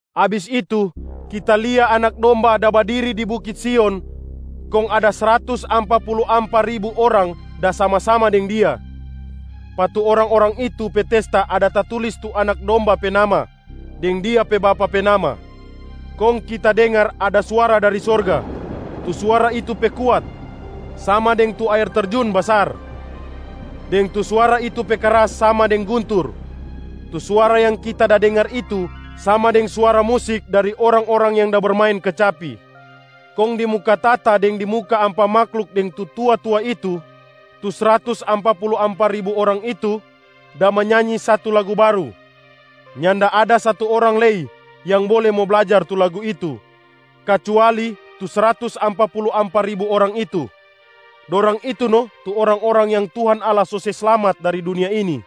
Abis itu, kita lia Anak Domba da badiri di bukit Sion kong ada sratus ampa pulu ampa ribu orang da sama-sama deng Dia. Pa tu orang-orang itu pe testa ada tatulis tu Anak Domba pe nama deng Dia pe Bapa pe nama. Kong kita dengar ada suara dari sorga. Tu suara itu pe kuat sama deng tu aer terjun basar, deng tu suara itu pe kras sama deng guntur. Tu suara yang kita da dengar itu sama deng suara musik dari orang-orang yang da bermain kecapi. Kong di muka tahta deng di muka ampa mahluk deng tu tua-tua itu, tu sratus ampa pulu ampa ribu orang itu da manyanyi satu lagu baru. Nyanda ada satu orang lei yang bole mo blajar tu lagu itu kacuali tu sratus ampa pulu ampa ribu orang itu. Dorang itu no tu orang-orang yang Tuhan Allah so se slamat dari dunia ini.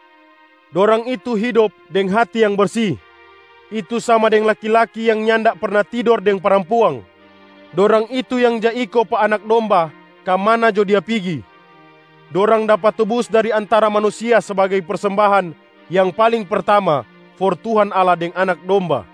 Dorang itu hidop deng hati yang bersi, itu sama deng laki-laki yang nyanda perna tidor deng parampuang. Dorang itu yang ja iko pa Anak Domba ka mana jo Dia pigi. Dorang dapa tubus dari antara manusia sbagai persembahan yang paling pertama for Tuhan Allah deng Anak Domba.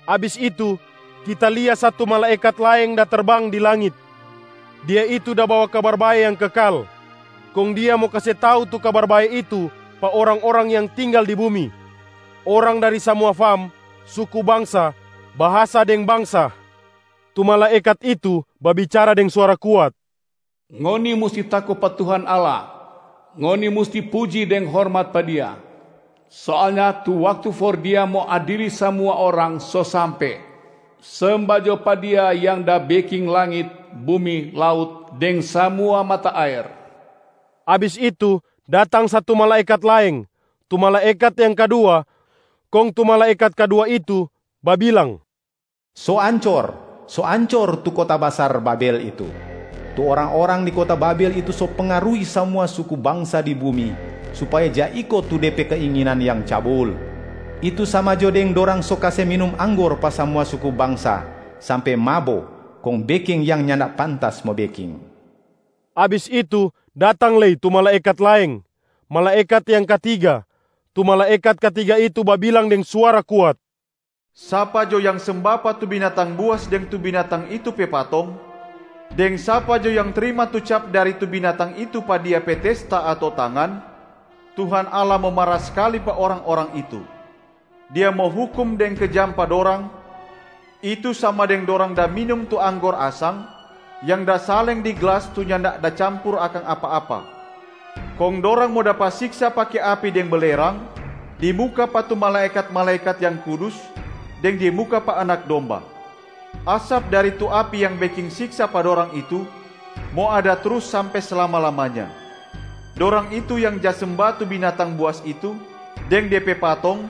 Abis itu, kita lia satu malaekat laeng da terbang di langit. Dia itu da bawa Kabar Bae yang kekal, kong dia mo kase tau tu Kabar Bae itu pa orang-orang yang tinggal di bumi, orang dari samua fam, suku bangsa, bahasa deng bangsa. Tu malaekat itu babicara deng suara kuat, “Ngoni musti tako pa Tuhan Allah, ngoni musti puji deng hormat pa Dia. Soalnya tu waktu for Dia mo adili samua orang so sampe. Semba jo pa Dia yang da beking langit, bumi, laut deng samua mata aer.” Abis itu, datang satu malaekat laeng, tu malaekat yang kadua. Kong tu malaekat kadua itu babilang, “So ancor, so ancor tu kota basar Babel itu! Tu orang-orang di kota Babel itu so pengaruhi samua suku bangsa di bumi supaya ja iko tu de pe keinginan yang cabul, itu sama jo deng dorang so kase minum anggor pa samua suku bangsa sampe mabo kong beking yang nyanda pantas mo beking.” Abis itu, datang lei tu malaekat laeng, malaekat yang katiga. Tu malaekat katiga itu babilang deng suara kuat, “Sapa jo yang semba pa tu binatang buas deng tu binatang itu pe patong, deng sapa jo yang trima tu cap dari tu binatang itu pa dia pe testa ato tangan, Tuhan Allah mo mara skali pa orang-orang itu. Dia mo hukum deng kejam pa dorang, itu sama deng dorang da minum tu anggor asang yang da saleng di glas tu nyanda da campur akang apa-apa. Kong dorang mo dapa siksa pake api deng belerang di muka pa tu malaekat-malaekat yang kudus deng di muka pa Anak Domba. Asap dari tu api yang beking siksa pa dorang itu mo ada trus sampe slama-lamanya. Dorang itu yang ja semba tu binatang buas itu deng de pe patong,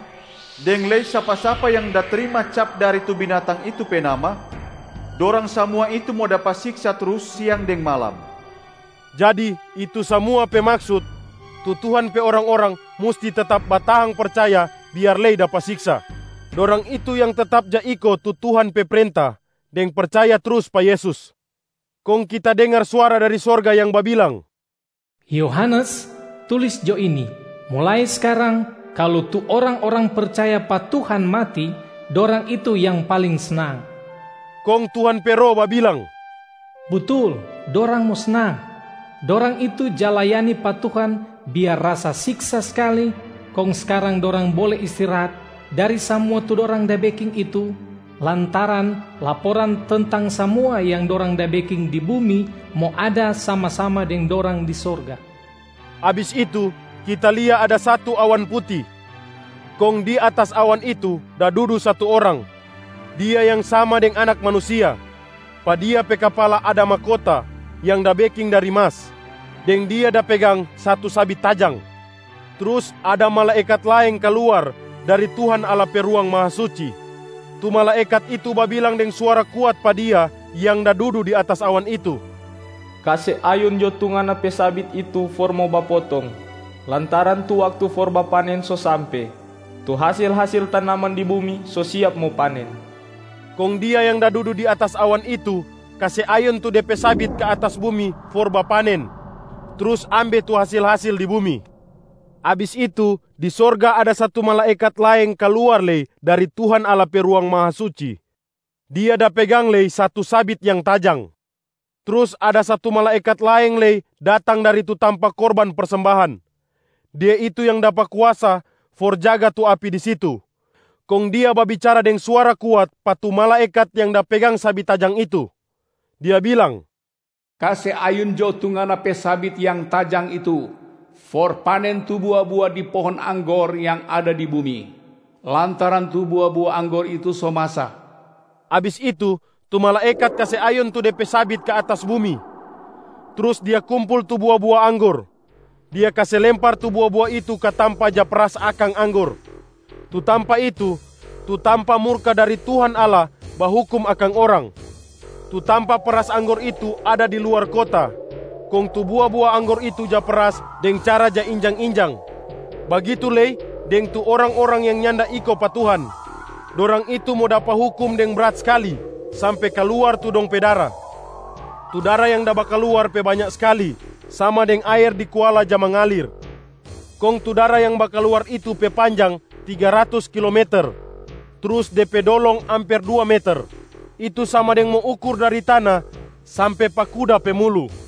deng lei sapa-sapa yang da trima cap dari tu binatang itu pe nama, dorang samua itu mo dapa siksa trus siang deng malam.” Jadi itu samua pe maksut: tu Tuhan pe orang-orang musti tetap batahang percaya biar lei dapa siksa, dorang itu yang tetap ja iko tu Tuhan pe prenta deng percaya trus pa Yesus. Kong kita dengar suara dari sorga yang babilang, “Yohanes, tulis jo ini: mulai skarang, kalu tu orang-orang percaya pa Tuhan mati, dorang itu yang paling snang!” Kong Tuhan pe Roh babilang, “Butul, dorang mo snang! Dorang itu ja layani pa Tuhan biar rasa siksa skali kong skarang dorang bole istirahat dari samua tu dorang da beking itu, lantaran laporan tentang samua yang dorang da beking di bumi mo ada sama-sama deng dorang di sorga.” Abis itu kita lia ada satu awan puti, kong di atas awan itu da dudu satu orang. Dia yang sama deng Anak Manusia. Pa Dia pe kapala ada mahkota yang da beking dari mas, deng Dia da pegang satu sabit tajang. Trus ada malaekat laeng kaluar dari Tuhan Allah pe Ruang Mahasuci. Tu malaekat itu babilang deng suara kuat pa Dia yang da dudu di atas awan itu, “Kase ayun jo tu ngana pe sabit itu for mo bapotong, lantaran tu waktu for bapanen so sampe, tu hasil-hasil tanaman di bumi so siap mo panen.” Kong Dia yang da dudu di atas awan itu kase ayun tu De pe sabit ka atas bumi for bapanen, trus ambe tu hasil-hasil di bumi. Abis itu, di sorga ada satu malaekat laeng kaluar lei dari Tuhan Allah pe Ruang Mahasuci. Dia da pegang lei satu sabit yang tajang. Trus ada satu malaekat laeng lei datang dari tu tampa korban persembahan. Dia itu yang dapa kuasa for jaga tu api di situ. Kong dia babicara deng suara kuat pa tu malaekat yang da pegang sabit tajang itu, dia bilang, “Kase ayun jo tu ngana pe sabit yang tajang itu for panen tu bua-bua di pohong anggor yang ada di bumi, lantaran tu bua-bua anggor itu so masa.” Abis itu, tu malaekat kase ayun tu de pe sabit ka atas bumi, trus dia kumpul tu bua-bua anggor. Dia kase lempar tu bua-bua itu ka tampa ja peras akang anggor, tu tampa itu tu tampa murka dari Tuhan Allah bahukum akang orang. Tu tampa peras anggor itu ada di luar kota. Kong tu bua-bua anggor itu ja peras deng cara ja injang-injang, bagitu lei deng tu orang-orang yang nyanda iko pa Tuhan, dorang itu mo dapa hukum deng brat skali sampe kaluar tu dong pe dara. Tu dara yang da bakaluar pe banya skali sama deng aer di kuala ja mengalir, kong tu dara yang bakaluar itu pe panjang tiga ratus kilometer, trus de pe dolong amper dua meter, itu sama deng mo ukur dari tana sampe pa kuda pe mulu.